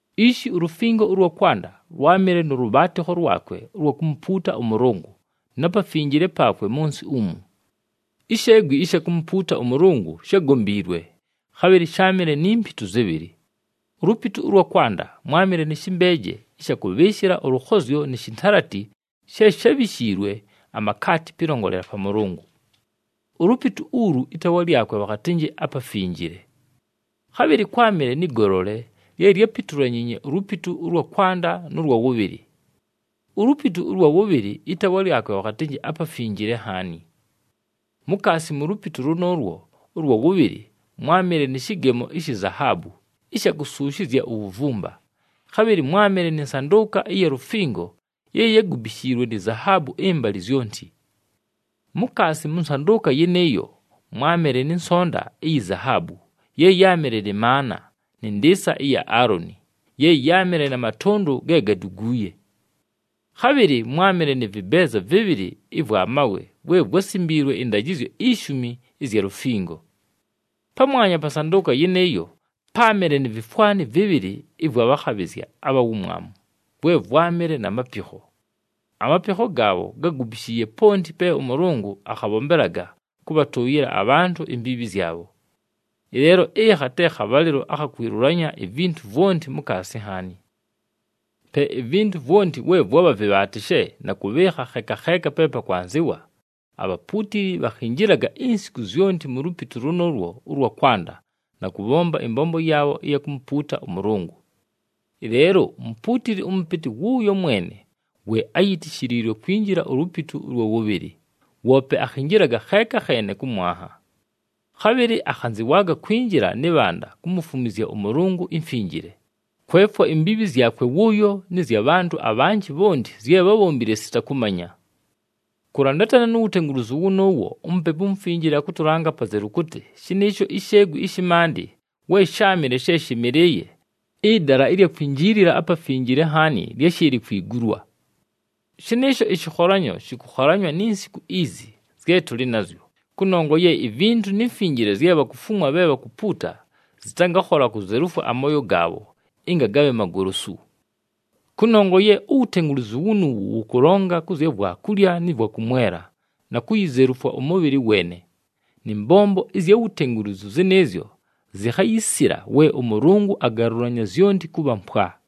Ishi ulufingo ʉlwa kwanda lwámɨle nʉ lʉbhaatɨkho lwakwe ʉlwa kumupuuta ʉMʉlʉngʉ, na pafinjile paakwe, mʉ nsɨ umu. Isheegwi ɨsha kumupuuta ʉMʉlʉngʉ shágombiilwe, khabhɨlɨ sháamɨle ni mpitu zɨbhɨlɨ. Ulupitu ʉlwa kwanda mwámɨle nɨ shɨmbeeje ɨsha kʉbhɨɨshɨla ʉlʉkhozyo ni shintalati she shábhishiilwe amakaati pɨlongolela pa Mʉlʉngʉ. Ulupitu ulu ɨtaawa lyakwe bhakhatɨnjɨ aPafinjile. Khabhɨlɨ kwámɨle nɨ golole, lye lyápitulanyiinye ulupitu ʉlwa kwanda nʉ lwa wʉbhɨlɨ. Ulupitu ʉlwa wʉbhɨlɨ ɨtaawa lyakwe bhakhatɨnjɨ aPafinjile Nhaani. Mukaasi mu lupitu lʉnʉʉlwo ʉlwa wʉbhɨlɨ mwámɨle nɨ shɨgemo ishi zahaabu ɨsha kusuushizya uwuvumba, khabhɨlɨ mwámɨle nɨ nsandʉʉka ɨya lufingo ye yágubishiliilwe ni zahaabu ɨmbalɨ zyonti. Mukaasi mʉ nsandʉʉka yɨnɨɨyo, mwámɨle nɨ nsonta iyi zahaabu ye yáamɨle nɨ maana nɨ ndɨɨsa ɨya Aaloni ye yáamɨle na matʉndʉ ge gáduguuye. Khabhɨlɨ mwámɨle nɨ vɨbeeza vɨbhɨlɨ ɨvwa mawe vwe vwásimbiilwe ɨndajɨzyo ishumi ɨzya lufingo. Pamwanya pa nsandʉʉka yɨnɨɨyo, páamɨle ni vifwani vɨbhɨlɨ ɨvwa bhakhabhɨzya abha wumwamu, vwe vwámɨle na mapikho. Amapikho gaabho gágubishiiye ponti pe ʉMʉlʉngʉ akhabhombelaga kʉbhatʉʉyɨla abhantʉ imbiibhi zyabho. Ɨleelo, ɨkha te khabhalɨlo akha kwilulanya ivintu vwonti mukaasi nhaani. Pe ivintu vwonti we vwabha vɨbhaatɨshe na kʉbhɨɨkha kheeka kheeka pe pakwanzɨwa, abhapuutili bhakhinjilaga insiku zyonti mu lupitu lʉnʉʉlwo ʉlwa kwanda na kʉbhomba ɨmbombo yaabho ɨya kumupuuta ʉMʉlʉngʉ. Ɨleelo umupuutili ʉmʉpɨtɨ wʉʉyo mwene we áyitishiliilwe kwinjila ulupitu ʉlwa wʉbhɨlɨ, woope akhinjilaga kheeka kheene kʉ mwanha. Khabhɨlɨ akhanzɨwaaga kwinjila nɨ bhanda kumufumwizya ʉMʉlʉngʉ imfinjile, kwefwa imbiibhi zyakwe wʉʉyo nɨ zya bhantʉ abhanjɨ bhonti zye bhábhombile sita kʉmanya. Kʉlandatana nu wutengulizu wʉnʉʉwo, uMupepu uMufinjile akʉtʉlanga apazelu kʉtɨ shɨnɨɨsho isheegwi ɨshɨ maandɨ we sháamɨle she shɨmɨlɨɨye, ɨdala ɨlya kwinjiilila aPafinjile Nhaani lyáshɨɨlɨ kwigulwa. Shɨnɨɨsho ɨshɨkholanyo shɨkʉkholanywa ni nsiku izi zye tʉlɨ nazyo, kʉnongwa ye ivintu ni mfinjile zye bhakufumwa bhe bhakupuuta zɨtangakhola kuzelufwa amooyo gaabho ɨnga gabhe magolosu. Kʉnongwa ye uwutengulizu wunuuwu wʉkʉlonga kʉ zya vwakulya nɨ vwakʉmwela, na kuyizelufwa ʉmʉbhɨlɨ weene, nɨ mbombo ɨzya wutengulizu zɨnɨɨzyo zikhayisila we ʉMʉlʉngʉ agalʉlanya zyonti kʉbha mpwa.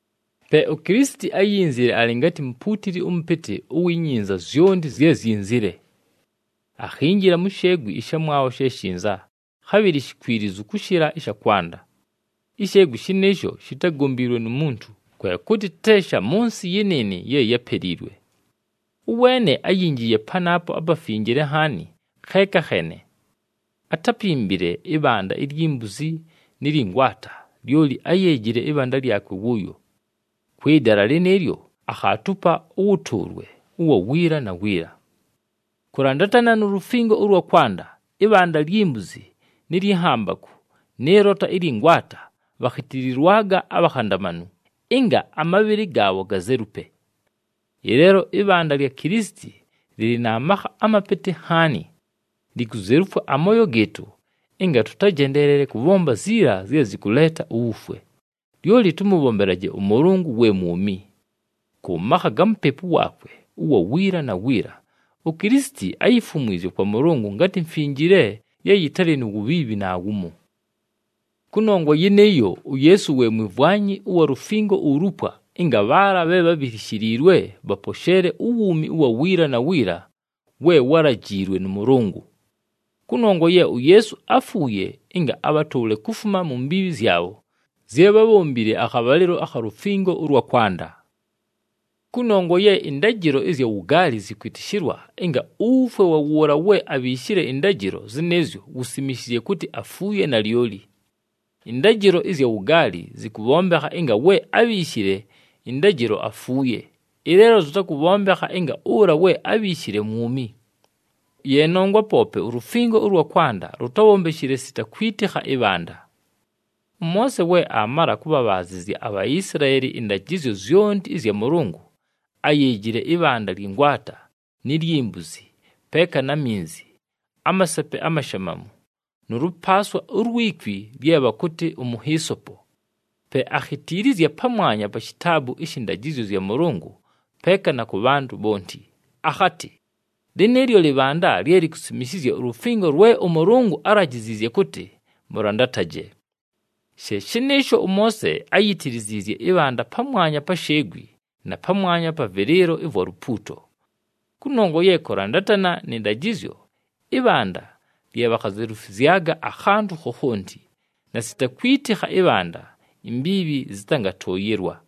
Pe uKilisiti áyinzile alɨ ngatɨ mupuutili ʉmʉpɨtɨ uwi nyinza zyonti zye zyinzile. Akhinjila mu sheegwi ɨshamwabho she shinza, khabhɨlɨ shikwilizu kʉshɨla ɨsha kwanda. Isheegwi shɨnɨɨsho shitágombiilwe nu muntu, kwe kʉtɨ te sha mʉ nsɨ yɨnɨɨnɨ ye yápeliilwe. Ʉweene áyinjiiye panaapo aPafinjile Nhaani kheeka kheene. Atápimbile ɨbhanda ilyi mbuzi nɨ lyɨ ngwata, lyoli áyeejile ɨbhanda lyakwe wʉʉyo. Kwɨ dala lɨnɨɨlyo akhaatupa ʉwʉtʉʉlwe ʉwa wiila na wiila. Kʉlandatana nu lufingo ʉlwa kwanda, ɨbhanda lyi mbuzi nɨ lyɨ nhambakʉ nɨ lota ɨlyɨ ngwata bhakhitililwaga abhakhandamanu, ɨnga amabhɨlɨ gaabho gazelupe. Ɨleelo ɨbhanda lya Kilisiti lɨlɨ na makha amapɨtɨ nhaani! Likuzelufwa amooyo gɨɨtʉ ɨnga tʉtajendeelele kʉbhomba ziila zye zɨkʉleeta uwufwe, lyoli tʉmʉbhombelaje ʉMʉlʉngʉ we mwumi. Kʉ makha ga Mupepu waakwe ʉwa wiila na wiila, uKilisiti áyifumwizye kwa Mʉlʉngʉ ngatɨ mfinjile ye yɨtalɨ nu wubhiibhi naawumo. Kʉnongwa yɨnɨɨyo, uYeesu we mwimvwanyi ʉwa lufingo ulupwa ɨnga bhaala bhe bhabhilishiliilwe bhaposheele uwuumi ʉwa wiila na wiila we wálajiilwe nʉ Mʉlʉngʉ. Kʉnongwa ye uYeesu áfuuye ɨnga abhatʉʉle kufuma mu mbiibhi zyabho zye bhábhombile akhabhalɨlo akha lufingo ʉlwa kwanda. Kʉnongwa ye ɨndajɨlo ɨzya wugaali zɨkwɨtɨshɨlwa ɨnga uwufwe wa wʉʉla we abhiishile ɨndajɨlo zɨnɨɨzyo wusimishizye kʉtɨ afuuye nalyoli. Ɨndajɨlo ɨzya wugaali zɨkʉbhombekha ɨnga we ábhiishile ɨndajɨlo afuuye, ɨleelo zɨtakʉbhombekha ɨnga ʉla we ábhiishile mwumi. Ye nongwa poope ulufingo ʉlwa kwanda lutábhombeshile sita kwitikha ɨbhanda. ɄMoose we aamala kʉbhabhaazɨzya aBhaisilaeli ɨndajɨzyo zyonti ɨzya Mʉlʉngʉ, áyeejile ɨbhanda lyɨ ngwata ni lyi mbuzi, peeka na minzi, amasepe amashamamu, nʉ lʉpaaswa ulwi kwi lye bhakʉtɨ umuhiisopo. Pe akhitiilizya pamwanya pa shitaabu ɨshɨ Ndajɨzyo zya Mʉlʉngʉ peeka na kʉ bhantʉ bhonti, akhatɨ, “Lɨnɨɨlyo lɨbhanda lye likusimishizya ulufingo lwe ʉMʉlʉngʉ álajiziizye kʉtɨ mʉlandataje.” She shɨnɨɨsho, ʉMoose áyitiliziizye ɨbhanda pamwanya pa sheegwi na pamwanya pa vɨlɨɨlo ɨvwa lupuuto. Kʉnongwa ye kʉlandatana nɨ ndajɨzyo, ɨbhanda lye bhakhazelufwizyaga akhantʉ khokhonti, na sita kwitikha ɨbhanda imbiibhi zɨtangatʉʉyɨlwa.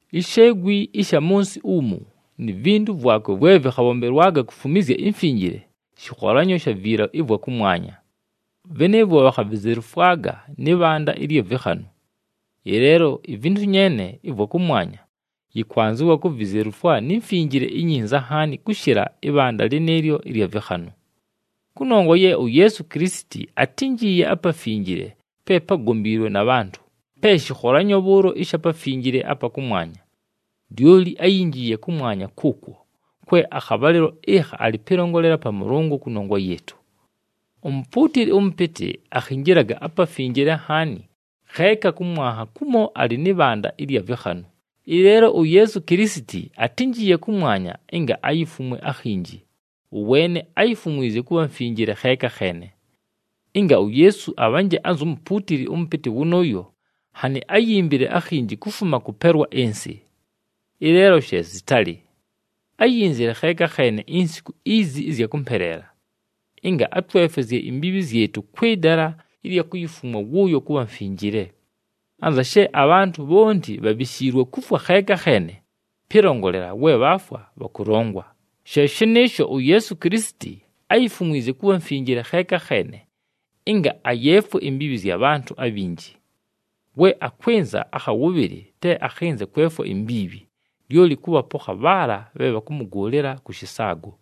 Isheegwi ɨsha mʉ nsɨ umu ni vintu vwakwe vwe vɨkhabhombelwaga kufumwizya imfinjile, shɨkholanyo sha viila ɨvwa kʉmwanya. Vɨnɨɨvwo bhakhavizelufwaga nɨ bhanda ɨlya vɨkhanʉ. Ɨleelo ivintu nyeene ɨvwa kʉmwanya, yɨkwanzɨwa kuvizelufwa ni mfinjile inyinza nhaani kʉshɨla ɨbhanda lɨnɨɨlyo ɨlya vɨkhanʉ. Kʉnongwa ye uYeesu Kilisiti atínjiiye apafinjile pe págombiilwe na bhantʉ, pe shɨkholanyo bhʉʉlo ɨsha Pafinjile apa kʉmwanya. Lyoli áyinjiiye kʉmwanya kʉʉkwo, kwe akhabhalɨlo ɨkha alɨ pɨlongolela pa Mʉlʉngʉ kʉnongwa yɨɨtʉ. Umupuutili ʉmʉpɨtɨ akhinjilaga aPafinjile Nhaani kheeka kʉ mwanha kumo alɨ nɨ bhanda ɨlya vɨkhanʉ, ɨleelo uYeesu Kilisiti atínjiiye kʉmwanya ɨnga ayifumwe akhinji, ʉweene áyifumwizye kʉbha mfinjile kheeka kheene. Ɨnga uYeesu abhanje anzu mupuutili ʉmʉpɨtɨ wʉnʉʉyo, nhanɨ áyimbile akhinji kufuma kʉpelwa ɨnsɨ. Ɨleelo she zɨtalɨ! Áyinzile kheeka kheene insiku izi ɨzya kʉmpeleela, ɨnga atwefwezye imbiibhi zyɨtʉ kwɨ dala ɨlya kuyifumwa wʉʉyo kʉbha mfinjile. Anza she abhantʉ bhonti bhabhishiilwe kufwa kheeka kheene, pɨlongolela we bhaafwa bhakʉlongwa, she shɨnɨɨsho, uYeesu Kilisiti áyifumwizye kʉbha mfinjile kheeka kheene ɨnga ayeefwe imbiibhi zya bhantʉ abhinji. We akwɨnza akha wʉbhɨlɨ, te akhɨnze kwefwa imbiibhi, lyoli kʉbhapokha bhaala bhe bhakʉmʉgʉʉlɨla kʉ shɨsaago.